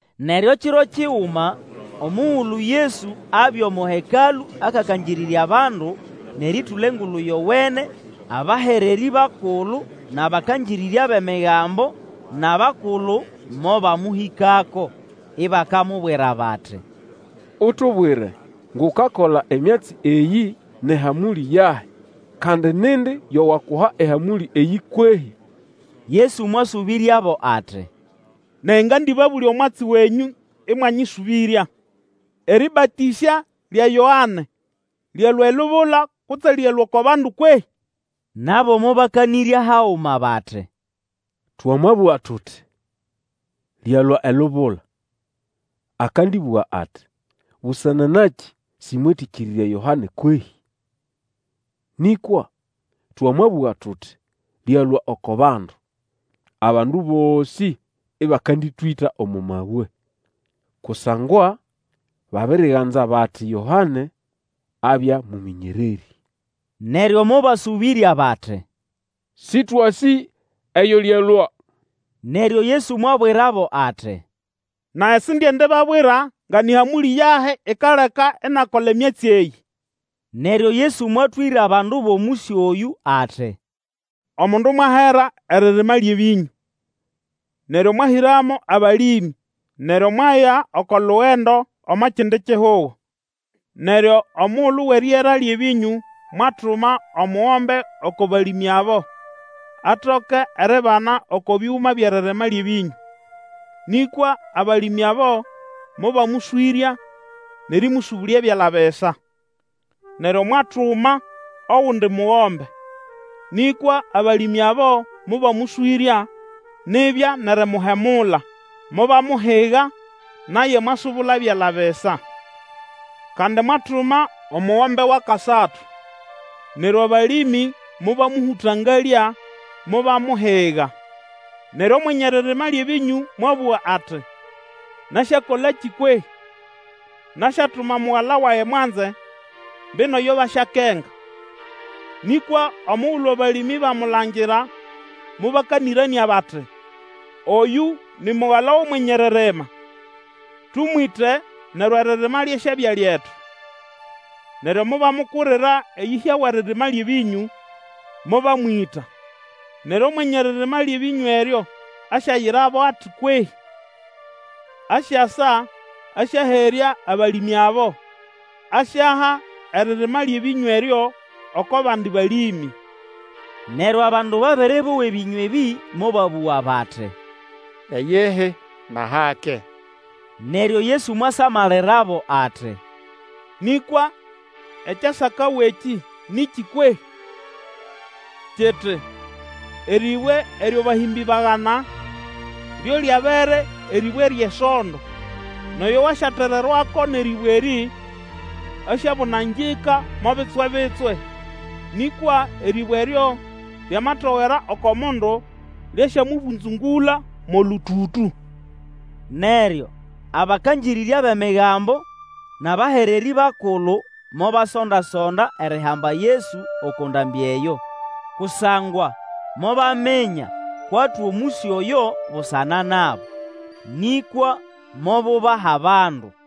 Neryo kiro kiguma, omugulu Yesu abya omo Hekalũ akakangĩrĩrya abandu, nʼerĩtũla Engulu Yowene, abahererĩ bakulu nʼabakangĩrĩrya bʼEmigambo, nʼabakulu, mobamũhĩkako, ibakamubwira bati, Utubwire ngʼukakola emyatsi eyĩ nʼehamũlĩ yahi, kandi nindi yo wakuha ehamũlĩ eyĩ kwehĩ? Yesu mwasũbĩryabo ati, Nage ngandĩbabũlya omwatsi nenyũ ĩmwanyĩsũbĩrya, Erĩbatĩsya lya Yoane lyalũa elubula kutse lyalũa oko bandu kwehĩ? Nabo mobakanĩrya haguma bati, Twamabũga tuti, Lyalũa elubula, akandĩbũga ati, Busana nakĩ sĩmwetĩkĩrĩrya Yoane kwehĩ? Nĩkwa twamabũga tuti, Lyalũa oko bandu, abandu bosĩ ĩbakandĩtwĩta omo mabwe, kusangwa babiriganza bati Yoane abya mũmĩnyererĩ. Neryo mobasũbĩrya bati, Sĩtwasĩ eyo lyalũa. Neryo Yesu mwabwirabo ati, Nage sindiendibabwira nga nĩ hamũlĩ yahi ikaleka inakola emyatsi eyĩ. Neryo Yesu mwatwĩra abandu bʼomũsyo oyũ ati, Omundu mwahera eririma lyʼebĩnyũ, neryo mwahĩramo abalĩmĩ, neryo mwaya oko lugendo omo kindi kihugo. Neryo omugulu wʼeriera lyʼebĩnyũ mwatuma omugombe oko balĩmĩ abo, atoke eribana oko bĩgũma byʼeririma lyʼebĩnyũ; nĩkwa abalĩmĩ abo mobamũswĩrya nʼerĩmũsũbũlya byala bisa. Neryo mwatuma ogundi mugombe; nĩkwa abalĩmĩ abo mobamũswĩrya nibya nʼerimuhemula, mobamuhiga, naye mwasubula byala bisa. Kandi mwatuma omugombe wʼakasatu. Neryo abalĩmĩ mobamũhũtangalya, mobamuhiga. Neryo Omwenye eririma lyʼebĩnyũ mwabũga ati, Nasyakolakĩ kwehĩ? Nasyatuma mugala wage mwanze; mbino yo basyakenga. Nĩkwa omugulu abalĩmĩ bamulangira mobakanĩranĩa bati, Oyũ ni mugala wʼomwenye eririma. Tũmwĩte, neryo eririma lyasyabya lyetu. Neryo mobamukurira eyĩhya wʼeririma lyʼebĩnyũ, mobamwĩta. Neryo Omwenye eririma lyʼebĩnyũ eryo asyayirabo ati kwehĩ? Asyasa, asyaherya abalĩmĩ abo, asyaha eririma lyʼebĩnyũ eryo oko bandi balĩmĩ. Neryo abandu babere bowa ebĩnywa ebĩ, mobabũga bati, Iyihi, nʼahake. Neryo Yesu mwasamalirabo ati, Nĩkwa ekyasakawa ekĩ nĩkĩ kwehĩ? kiti, Erĩbwe eryo abahĩmbĩ bagana, Lyo lyabere erĩbwe ryʼesondo. Nʼoyo wasyatererwako nʼerĩbwe erĩ, asyabũnangĩka mo bitswe-bitswe; nĩkwa erĩbwe eryo lyamatogera oko mundu, lyasyamũbũnzũngũla mo lũtũtũ. Neryo abakangĩrĩrya bʼEmigambo nʼabahererĩ bakulu mobasonda-sonda erihamba Yesu oko ndambĩ eyo, kusangwa mobaminya kwʼatwa omũsyo oyo busana nabo; nĩkwa mobubaha abandu.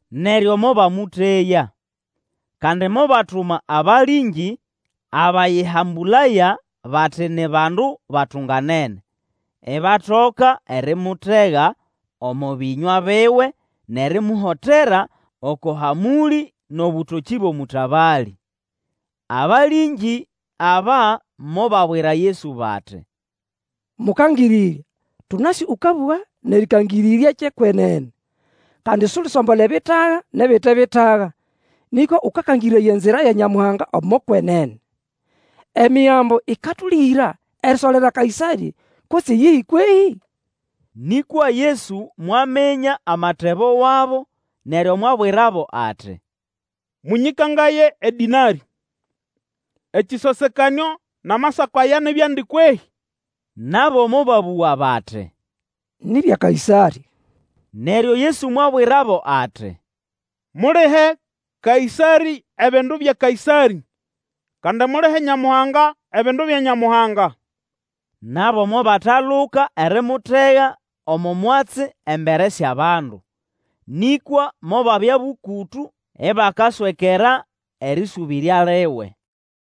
Neryo mobamũteya. Kandi mobatuma abalĩngĩ abayĩhambũlaya bati ni bandu batunganene, ibatoka erimutega omo bĩnywa biwe nʼerimuhotera oko hamũlĩ nʼobũtokĩ bwʼomũtabalĩ. Abalĩngĩ aba mobabwira Yesu bati, Mũkangĩrĩrya, tũnasĩ ũkabũga nʼerĩkangĩrĩrya ekyʼekwenene. Kandi sulisombola ebitaga nʼebite bitaga nĩkwa ũkakangĩrĩraya enzira ya Nyamuhanga omo kwenene. Emigambo ĩkatũlĩgĩra erisolera Kaĩsarĩ kutse iyihi kwehĩ? Nĩkwa Yesu mwaminya amatebo wabo, neryo mwabwirabo ati, Mũnyĩkangaye edĩnarĩ. Ekĩsosekanĩo nʼamasako aya ni byandi kwehĩ? Nabo mobabũga bati, Ni bya Kaĩsarĩ. Neryo Yesu mwabwirabo ati, Mulihe Kaĩsarĩ ebindu bya Kaĩsarĩ, kandi mulihe Nyamuhanga ebindu bya Nyamuhanga. Nabo mobataluka erimutega omo mwatsi embere syʼabandu. Nĩkwa mobabya bũkũtũ ibakaswekera erĩsũbĩrya liwe.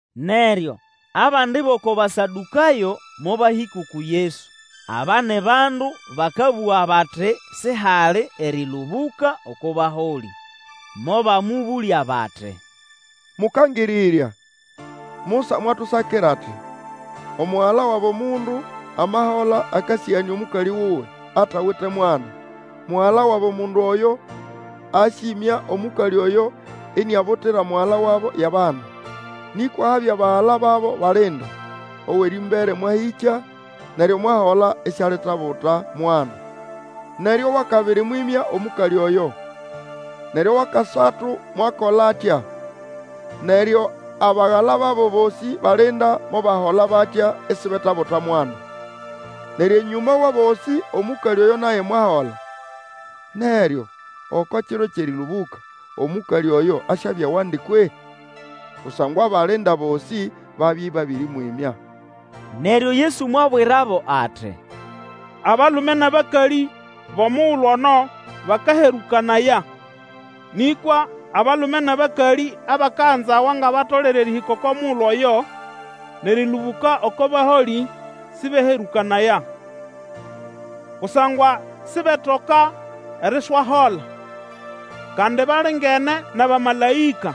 Neryo abandi bʼoko Basadũkayo mobahĩka uku Yesu. Aba ni bandu bakabũga bati sihali erĩlũbũka oko baholĩ. Mobamũbũlya bati, Mũkangĩrĩrya, Musa mwatusakira ati, Omugala wabo mundu amahola akasĩganĩa omũkalĩ wuwe, atawite mwana; mugala wabo mundu oyo asyĩmya omũkalĩ oyo iniabutira mugala wabo yʼabana. Nĩkwa habya bagala babo balinda; owʼerĩmbere mwahĩkya, neryo mwahola isialitabuta mwana. Neryo owʼakabiri mwĩmya omũkalĩ oyo. Neryo owʼakasatu mwakola atya; neryo abagala babo bosĩ balinda mobahola batya isibetabuta mwana. Neryo enyũma wʼabosĩ omũkalĩ oyo naye mwahola. Neryo oko kiro kyʼerĩlũbũka, omũkalĩ oyo asyabya wandi kwehĩ? Kusangwa abalinda bosĩ babya ĩbabĩrĩmwĩmya. Neryo Yesu mwabwirabo ati, Abalume nʼabakalĩ bʼomugulu ono bakaherũkanaya. Nĩkwa abalume nʼabakalĩ abakaganzawa nga batolere erĩhĩka oko mugulu oyo, nʼerĩlũbũka oko baholĩ, sĩbeherũkanaya. Kusangwa sibetoka eriswahola, kandi balingene nʼabamalaĩka.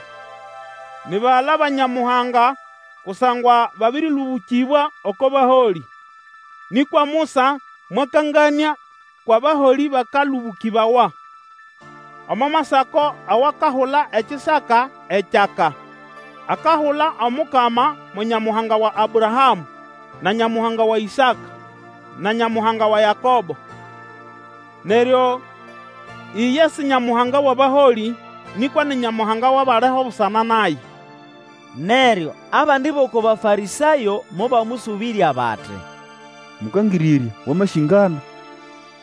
Ni bagala ba Nyamuhanga kusangwa babĩrĩlũbũkĩbwa oko baholĩ. Nĩkwa Musa mwakanganĩa kwʼabaholĩ bakalũbũkĩbawa. Omo masako awakahula ekisaka ekyaka, akahula Omukama, mo Nyamuhanga wa Abrahamũ, na Nyamuhanga wa Ĩsaka, na Nyamuhanga wa Yakobo. Neryo iye si Nyamuhanga wʼabaholĩ, nĩkwa ni Nyamuhanga wʼabaliho busana naye. Neryo abandi bʼoko Bafarĩsayo mobamũsũbĩrya bati, Mũkangĩrĩrya, wamasĩngana!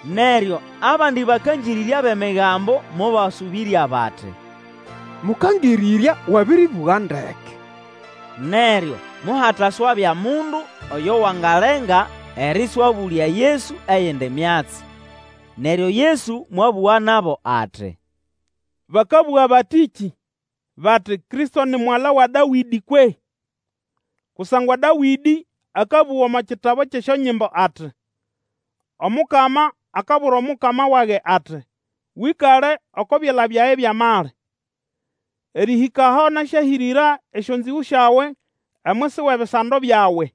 Neryo abandi bakangĩrĩrya bʼEmigambo mobasũbĩrya bati, Mũkangĩrĩrya, wabĩrĩbũga ndeke. Neryo mohataswabya mundu oyo wangalenga erĩswabũlya Yesu eyindi myatsi. Neryo Yesu mwabũga nabo ati, Bakabũga batĩkĩ, bati, Kristo ni mugala wa Dawĩdĩ kwehĩ? Kusangwa Dawĩdĩ akabũga omo kitabu kyʼesyonyimbo ati, Omukama akabwira Omukama wage ati, Wĩkale oko byala byage byʼamali, Erĩhĩka aho nasyahĩrĩra esyonzĩgũ syawe Omwisi wʼebisando byawe.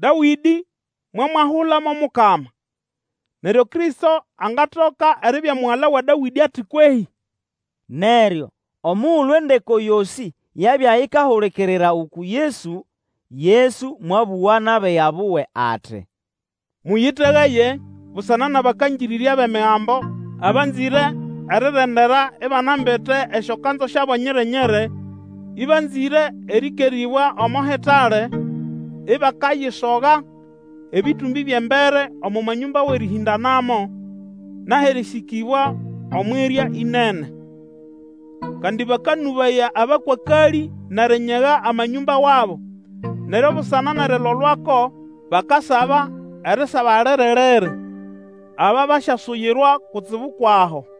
Dawĩdĩ mwamwahula mo Mukama, neryo Kristo angatoka eribya mugala wa Dawĩdĩ ati kwehĩ? Neryo omugulu endeko yosĩ yabya ikahulikirira uku Yesu, Yesu mwabũga nʼabiga buwe ati, Mũyĩtegaye busana nʼabakangĩrĩrya bʼEmigambo abanzĩre erirendera ibanambite esyokanzu syabo nyiri-nyiri, ĩbanzĩre erĩkerĩbwa omo hitale, ibakayisoga ebĩtũmbĩ byʼembere omo manyũmba wʼerĩhĩndanamo, nʼahʼerĩsĩkĩbwa omwʼirya ĩnene. Kandi bakanũbaya abakwakalĩ nʼerinyega amanyũmba wabo, neryo busana nʼerilolwako bakasaba erisaba liri-liri! Aba basyasuyirwa kutsibu kwʼaho.